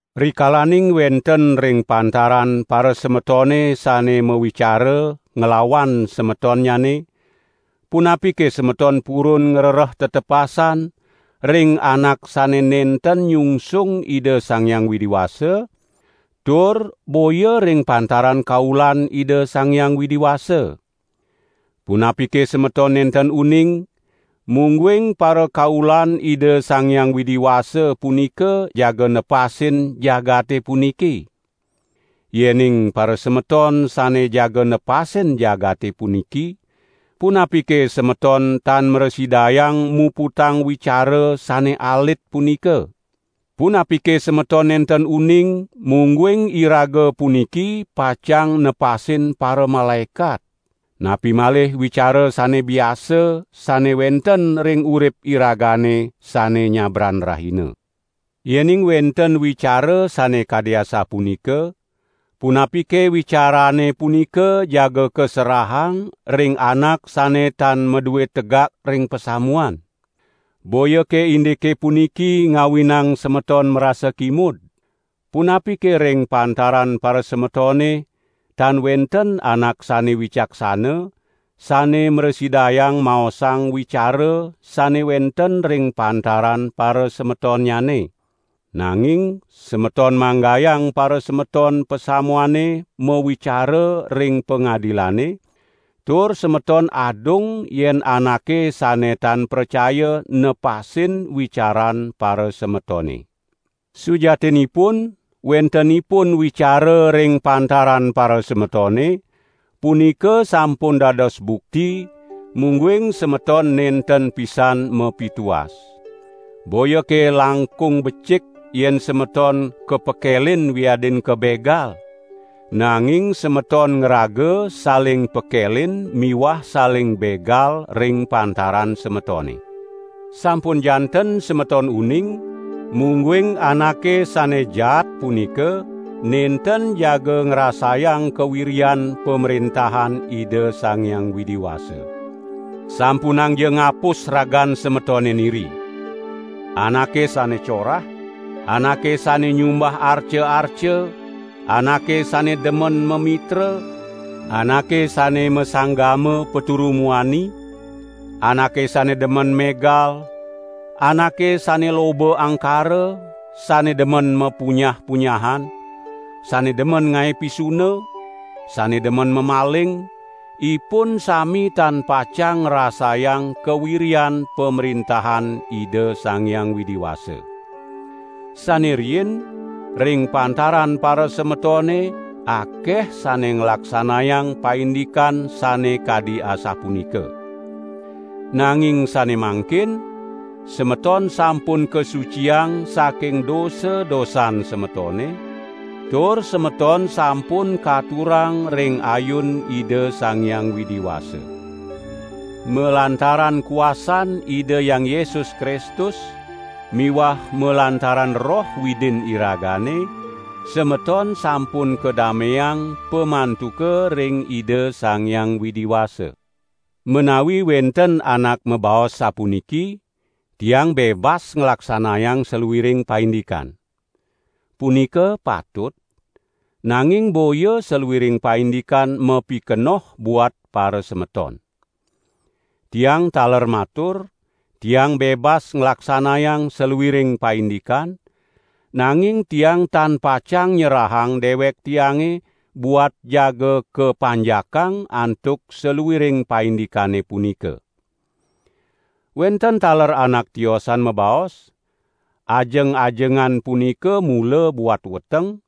Rikalaning wenten ring pantaran parasemetone sane mawicara nglawan semetonnyane, punapike semeton purun ngrereh tetepasan ring anak sane nenten nyungsung Ida Sang Hyang Widi Wasa, tur boya ring pantaran kaulan Ida Sang Hyang Widi Wasa? Punapike semeton nenten uning mungguing parakaulan Ida Sang Hyang Widi Wasa punika jaga nepasin jagate puniki? Yening parasemeton sane jaga nepasin jagate puniki, punapike semeton tan mrasidayang muputang wicara sane alit punika? Punapike semeton nenten uning mungguing iraga puniki pacang nepasin paramalaekat? Napi malih wicara sane biasa sane wenten ring urip iragane sane nyabran rahina. Yening wenten wicara sane kadi asapunika, punapike wicarane punika jaga kaserahang ring anak sane tan madue tegak ring pasamuan? Boyake indike puniki ngawinang semeton marasa kimud? Punapike ring pantaran parasemetone tan wenten anak sane wicaksana, sane mrasidayang maosang wicara sane wenten ring pantaran parasemetonnyane? Nanging semeton manggayang parasemeton pasamuane mawicara ring pangadilane, tur semeton adung yen anake sane tan pracaya nepasin wicaran parasemetone. Sujatinipun wentenipun wicara ring pantaran parasemetone, punika sampun dados bukti mungguing semeton nenten pisan mapituas. Boyake langkung becik, yen semeton kapekelin wiadin kabegal? Nanging semeton ngraga saling pekelin miwah saling begal ring pantaran semetone. Sampun janten semeton uning mungguing anake sane jaat punika nenten jaga ngrasayang kawiryan Pamrentahan Ida Sang Hyang Widi Wasa. Sampunangja ngapus ragan semetone niri! Anake sane corah, anake sane nyumbah arca-arca, anake sane demen mamitra, anake sane masanggama paturu muani, anake sane demen megal, anake sane loba angkara, sane demen mapunyah-punyahan, sane demen ngae pisuna, sane demen mamaling, ipun sami tan pacang ngrasayang kawiryan Pamrentahan Ida Sang Hyang Widi Wasa. Sane riin, ring pantaran parasemetone akeh sane nglaksanayang paindikan sane kadi asapunika. Nanging sane mangkin semeton sampun kasuciang saking dosa-dosan semetone, tur semeton sampun katurang ring ayun Ida Sang Hyang Widi Wasa. Malantaran kuasan Ida Hyang Yesus Kristus miwah malantaran Roh Widin iragane, semeton sampun kadameang pamantuka ring Ida Sang Hyang Widi Wasa. Menawi wenten anak mabaos sapuniki: "Tiang bebas nglaksanayang saluiring paindikan." Punika patut; nanging boya saluiring paindikan mapikenoh buat parasemeton. Tiang taler matur: "Tiang bebas nglaksanayang saluiring paindikan; nanging tiang tan pacang nyerahang dewek tiange buat jaga kapanjakang antuk saluiring paindikane punika." Wenten taler anak tiosan mabaos: "Ajeng-ajengan punika mula buat weteng,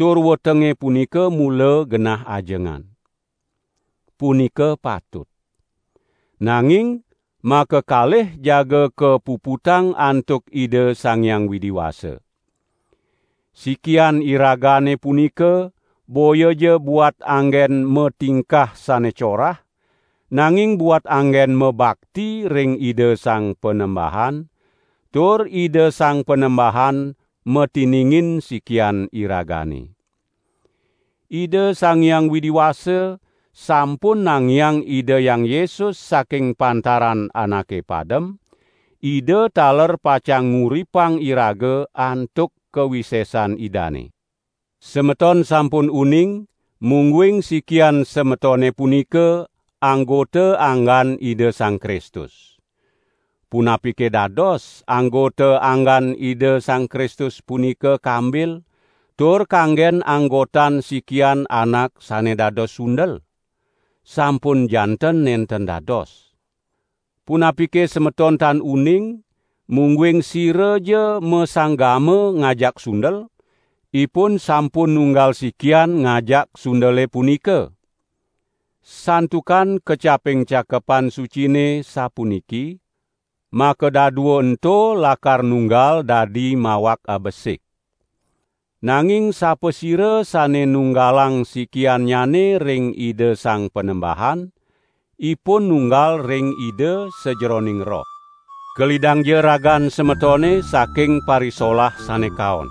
tur wetenge punika mula genah ajengan." Punika patut. Nanging makakalih jaga kapuputang antuk Ida Sang Hyang Widi Wasa. Sikian iragane punika boyaja buat anggen matingkah sane corah, nanging buat anggen mabakti ring Ida Sang Panembahan, tur Ida Sang Panembahan matiningin sikian iragane. Ida Sang Hyang Widi Wasa sampun nangiang Ida Hyang Yesus saking pantaran anake padem, Ida taler pacang nguripang iraga antuk kawisesan Idane. Semeton sampun uning mungguing sikian semetone punika anggota anggan Ida Sang Kristus. Punapike dados anggota anggan Ida Sang Kristus punika kambil tur kanggen anggotan sikian anak sane dados sundel? Sampun janten nenten dados! Punapike semeton tan uning mungguing siraja masanggama ngajak sundel, ipun sampun nunggal sikian ngajak sundele punika? Santukan kecaping Cakepan Sucine sapuniki: "Makadadua ento lakar nunggal dadi mawak abesik." Nanging sapasira sane nunggalang sikiannyane ring Ida Sang Panembahan, ipun nunggal ring Ida sajeroning roh. Kelidangja ragan semetone saking parisolah sane kaon!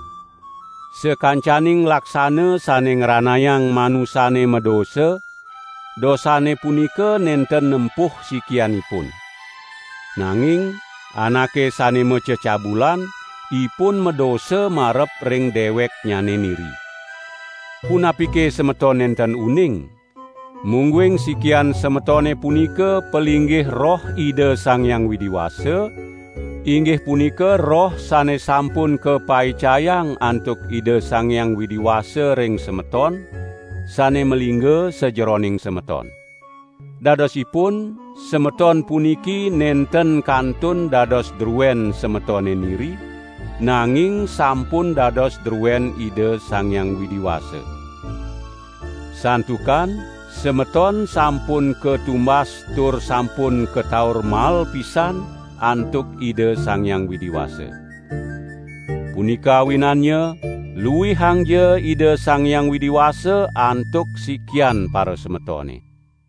Sakancaning laksana sane ngranayang manusane madosa, dosane punika nenten nempuh sikianipun. Nanging anake sane macecabulan, ipun madosa marep ring deweknyane niri. Punapike semeton nenten uning, mungguing sikian semetone punika palinggih Roh Ida Sang Hyang Widi Wasa, inggih punika Roh sane sampun kapaicayang antuk Ida Sang Hyang Widi Wasa ring semeton sane malingga sajeroning semeton. Dadosipun semeton puniki nenten kantun dados druen semetone niri, nanging sampun dados druen Ida Sang Hyang Widi Wasa. Santukan semeton sampun katumbas tur sampun kataur mael pisan antuk Ida Sang Hyang Widi Wasa. Punika awinannya, luihangja Ida Sang Hyang Widi Wasa antuk sikian parasemetone.